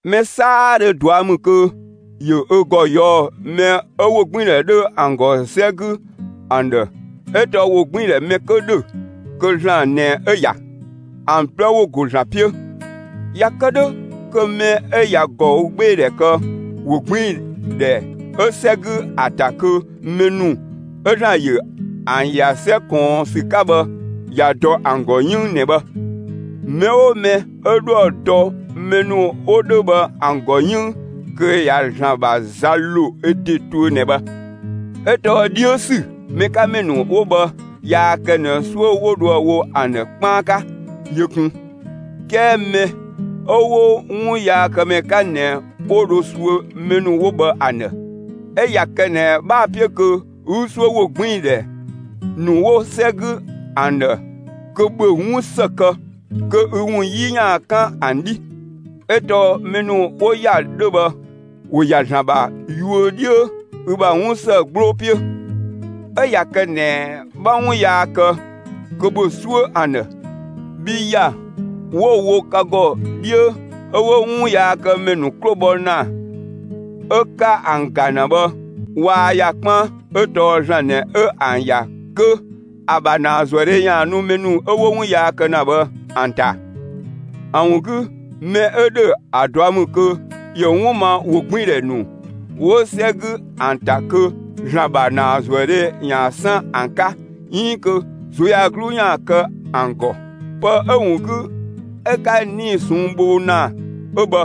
Mɛ 'saadhö ꞊dua' ‑mü kö ‑yö ö ‑gɔ ꞊yɔɔ'‑ mɛ 'ö ‑wogbiindhɛ 'dhö ‑an ‑gɔ 'sɛ 'gü ‑an ‑dhë 'ö tɔɔ ‑wogbiindhɛ mɛ 'kö ‑dhö, kö ‑Zlan ꞊nɛ 'ö‑ ‑ya. ‑An 'plɛ ‑wo ‑go ‑Zlan 'piö. ꞊Ya kë 'dhö kö mɛ 'ö ꞊ya ꞊gɔügbeedhɛ kë ‑wogbiindhɛ 'ö 'sɛ 'gü ‑a ‑ta kö mɛ ‑nu 'ö ‑Zlan ‑yö ‑an ‑ya 'sɛ ꞊kɔɔn ‑sü 'ka bhë, ꞊ya dɔ ‑an ‑gɔ 'yënng ꞊nɛ bhë. Mɛ 'oo mɛ 'ö 'dhoë‑ dɔ mɛ ‑nu 'wo 'dhö bhë ‑an ‑gɔ 'yënng kö ꞊ya ‑Zlan ‑bha za ‑lo ö ‑de tuö ꞊nɛ bhë. 'Ö tɔɔ 'dhiö ‑sü mɛ 'ka ‑mɛ ‑nu 'wo bhë, yaa kë ꞊nɛ 'suö 'wo dhoë‑ wo ‑an ‑dhë 'kpaan 'ka yö kun. 'Kɛɛ mɛ 'ö 'wo 'wunyaakëmɛ 'ka ꞊nɛ, 'wo dho suö mɛ ‑nu 'wo bhë ‑an ‑dhë. 'Ö ꞊ya kë ꞊nɛ 'bhaa‑ 'piö kö 'ü suö ‑wogbiindhɛ ‑nu 'wo 'sɛ 'gü ‑an ‑dhë, kö ‑bhö 'wun ‑së kë kö ü ‑wun 'yi ‑yaan 'kan ‑an 'dhi. 'Ö tɔɔ mɛ ‑nu 'wo ‑ya 'dhö bhë, ‑wo ‑ya ‑Zlan ‑bha yuö 'dhiö ü ‑bha 'wun ‑së 'gbloo 'piö. 'Ö ꞊ya kë ꞊nɛ 'bha 'wun yaa kë, kö ‑bhö 'suö ‑an ‑dhë. Bhii ‑ya 'wo‑ wo ka ‑gɔ 'dhiö 'ö 'wo 'wunyaakëmɛ ‑nu 'klo bhɔ ‑na 'ö 'ka ‑an ‑ga ‑na bhë, waa ‑ya 'kpaan. 'Ö tɔɔ ‑Zlan ꞊nɛ 'ö ‑an ‑ya kö ‑a ‑bha ‑naazuëdhe ‑yaan nu mɛ ‑nu 'ö 'wo 'wun yaa kë ‑na bhë ‑an ‑ta. ‑A ‑wun 'gü, ‑mɛ 'ö ‑dhö ‑a ꞊dua' ‑mü kö ‑yö 'wun ma ‑wogbiindhɛ ‑nu 'wo 'sɛ 'gü ‑an ‑ta kö ‑Zlan ‑bha ‑naazuëdhe ‑yaan 'san ‑an 'ka 'iin kö ꞊zuöyagluu ‑yaan kë ‑an ‑gɔ. Pë 'ö‑ ‑wun 'gü 'ö 'ka 'nii‑ ꞊sɔnng' bho ‑na 'ö bhë,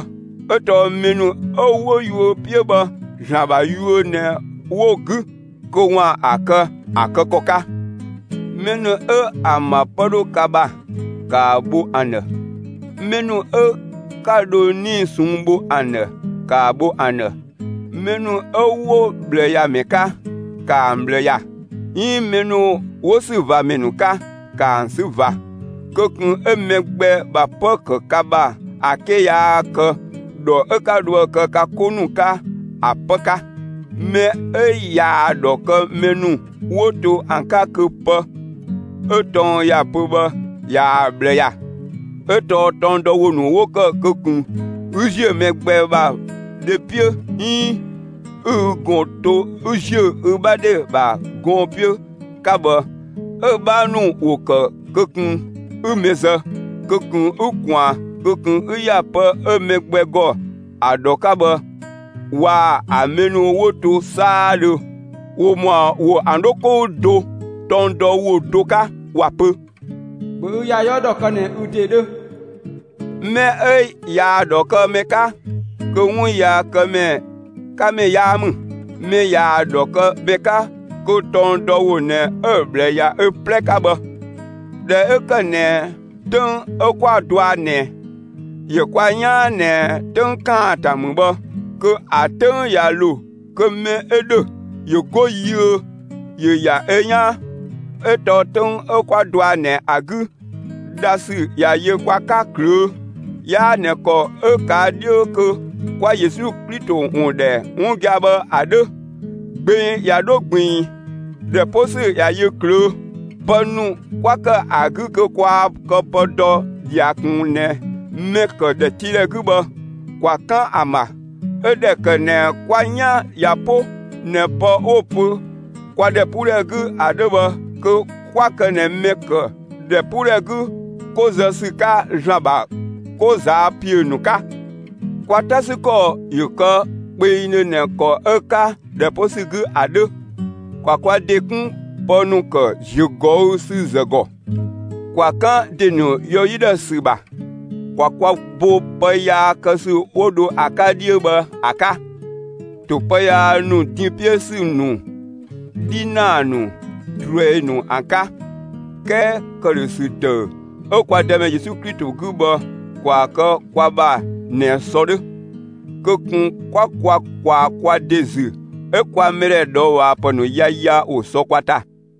'ö tɔɔ mɛ ‑nu 'ö 'wo‑ ‑yuö 'piö bhë, ‑Zlan ‑bha yuö ꞊nɛ 'wo‑ 'gü kö ‑waan ‑a kë ‑a kë ‑kɔ 'ka. Mɛ ‑nu 'ö ‑an ‑bha 'pë 'dhö ka ‑bha, ‑kaa bho ‑an ‑dhë. Mɛ ‑nu 'ö 'ka dho 'nii‑ ꞊sɔnng' bho ‑an ‑dhë, ‑kaa bho ‑an ‑dhë. Mɛ ‑nu 'ö 'wo ꞊bhlëyamɛ 'ka, ‑kaa ‑an ꞊bhlë ‑ya, 'iin mɛ ‑nu 'wo ‑sü ꞊va ‑mɛ ‑nu 'ka, ‑kaa ‑an 'sü ꞊va. Kö ꞊kun 'ö mɛ gbɛ ‑bha 'pë‑ ‑kë ka ‑bha ‑a 'ke yaa kë ‑dhɔ 'ö 'ka dhoë‑ kë ka 'ko ‑nu 'ka, ‑a 'pë 'ka. Mɛ 'ö ꞊yaa‑ ‑dhɔ kë mɛ ‑nu 'wo to ‑an 'ka, kö pë 'ö tɔng ‑ya pö bhë ꞊yaa‑ ꞊bhlë ‑ya. 'Ö tɔɔ tɔng dɔ ‑wo ‑nu 'wo ‑kë kö ꞊kun 'ü ‑ziö mɛ gbɛ ‑bha dhe 'piö, 'iin 'ü ü ꞊gɔn to 'ü ‑ziö ü 'bha dhe ‑bha gɔɔn‑ 'piö 'ka bhë, 'ö‑ 'bhaa ‑nu ‑wo ‑kë kö ꞊kun 'ü mɛ zë, kö ꞊kun 'ü ꞊kwaan, kö ꞊kun ü ‑ya pë 'ö mɛ gbɛ ‑gɔ ‑a ‑dhɔ 'ka bhë waa‑ ‑a mɛ ‑nu 'wo to 'saadhö, ‑wo ‑mɔa ‑wo ‑an 'dho 'kou do tɔng dɔ ‑wo do 'ka, ‑wa pö: ‑Bhö ü ‑ya 'yɔɔ ‑dhɔ kë ꞊nɛ ü ‑de 'dhö. Mɛ 'ö ꞊yaa‑ ‑dhɔ kë mɛ 'ka, kö 'wun yaa ‑kë mɛ 'ka ‑mɛ 'yaa ‑mü. Mɛ ꞊yaa‑ ‑dhɔ kë mɛ 'ka, kö tɔng dɔ ‑wo ꞊nɛ 'ö‑ ꞊bhlë ‑ya ö 'plɛ 'ka bhë. ꞊Dhɛ 'ö ‑kë ꞊nɛ 'töng 'ö 'kwa dɔa ꞊nɛ, ‑yö ka 'yaan ꞊nɛ 'töng ‑kaanta ‑mü bhë, kö ‑a 'töng ꞊ya ‑lo kö mɛ 'ö ‑dhö ‑yö 'go yiö, ‑yö ‑ya ö 'yaan. 'Ö tɔɔ 'töng 'ö 'kwa dɔa ꞊nɛ ‑a 'gü, dhasü ꞊ya yö kwa 'ka ꞊klöö'. 'Yaa ꞊nɛ ‑kɔ 'ö‑ 'ka 'dhiö kö 'kwa Yesu Klito ‑wun ‑dhɛ 'wun gia‑ bhë ‑a 'dhö. Gbeng ꞊ya 'dho ꞊gbiin, ‑dhɛ 'po ‑sü ꞊ya yö ꞊klöö'. Pë ‑nu 'kwa ‑kë ‑an 'gü kö kwaa kë pë dɔ ꞊dhia ꞊kun ꞊nɛ mɛ‑ ‑kë ‑dhɛtiidhɛ 'gü bhë, ‑kwa 'kan ‑an ‑bha; 'ö ꞊dhɛ ‑kë ꞊nɛ kwa 'yan ꞊ya 'po ꞊nɛ pë 'wo‑ pö kwa ‑dhɛpuudhɛ 'gü ‑a 'dhö bhë, kö 'kwa kë ꞊nɛ mɛ‑ ‑kë ‑dhɛpuudhɛ 'gü 'ko zë ‑sü 'ka ‑Zlan ‑bha 'ko ꞊zaa' ‑piö ‑nu 'ka. Kwa 'ta ‑sü ‑kɔ ‑yö kë kpengdhö ꞊nɛ ‑kɔ 'ö‑ 'ka ‑dhɛ 'po ‑sü 'gü ‑a 'dhö. ‑Kwa kwa ‑de 'kun pë ‑nu ‑kë ‑ziögɔüsüzë ‑gɔ; ‑kwa 'kan ‑de ‑nu yɔ 'yi ‑dhë ‑sü ‑bha; ‑kwa kwa bo pë yaa kë ‑sü 'wo dho ‑a 'ka bhë ‑a 'ka 'dhiö bhë ‑a 'ka, ‑to pë yaa ‑nu din 'piö ‑sü ‑nu 'dhinaa ‑nu, ꞊druɛi ‑nu ‑an 'ka. 'Kɛɛ ‑këdhösü ‑dëü 'ö kwa Dëmɛ Yesu Klito 'gü bhë ‑kwaa kë kwa ‑bha ꞊nɛ sɔ 'dhö. Kö ꞊kun 'kwa kwa ꞊kwaa kwa ‑de ‑zü 'ö kwa mɛ ‑dhɛ ꞊dhɔɔbhaapë ‑nu yaya ‑wo sɔ kwa ‑ta.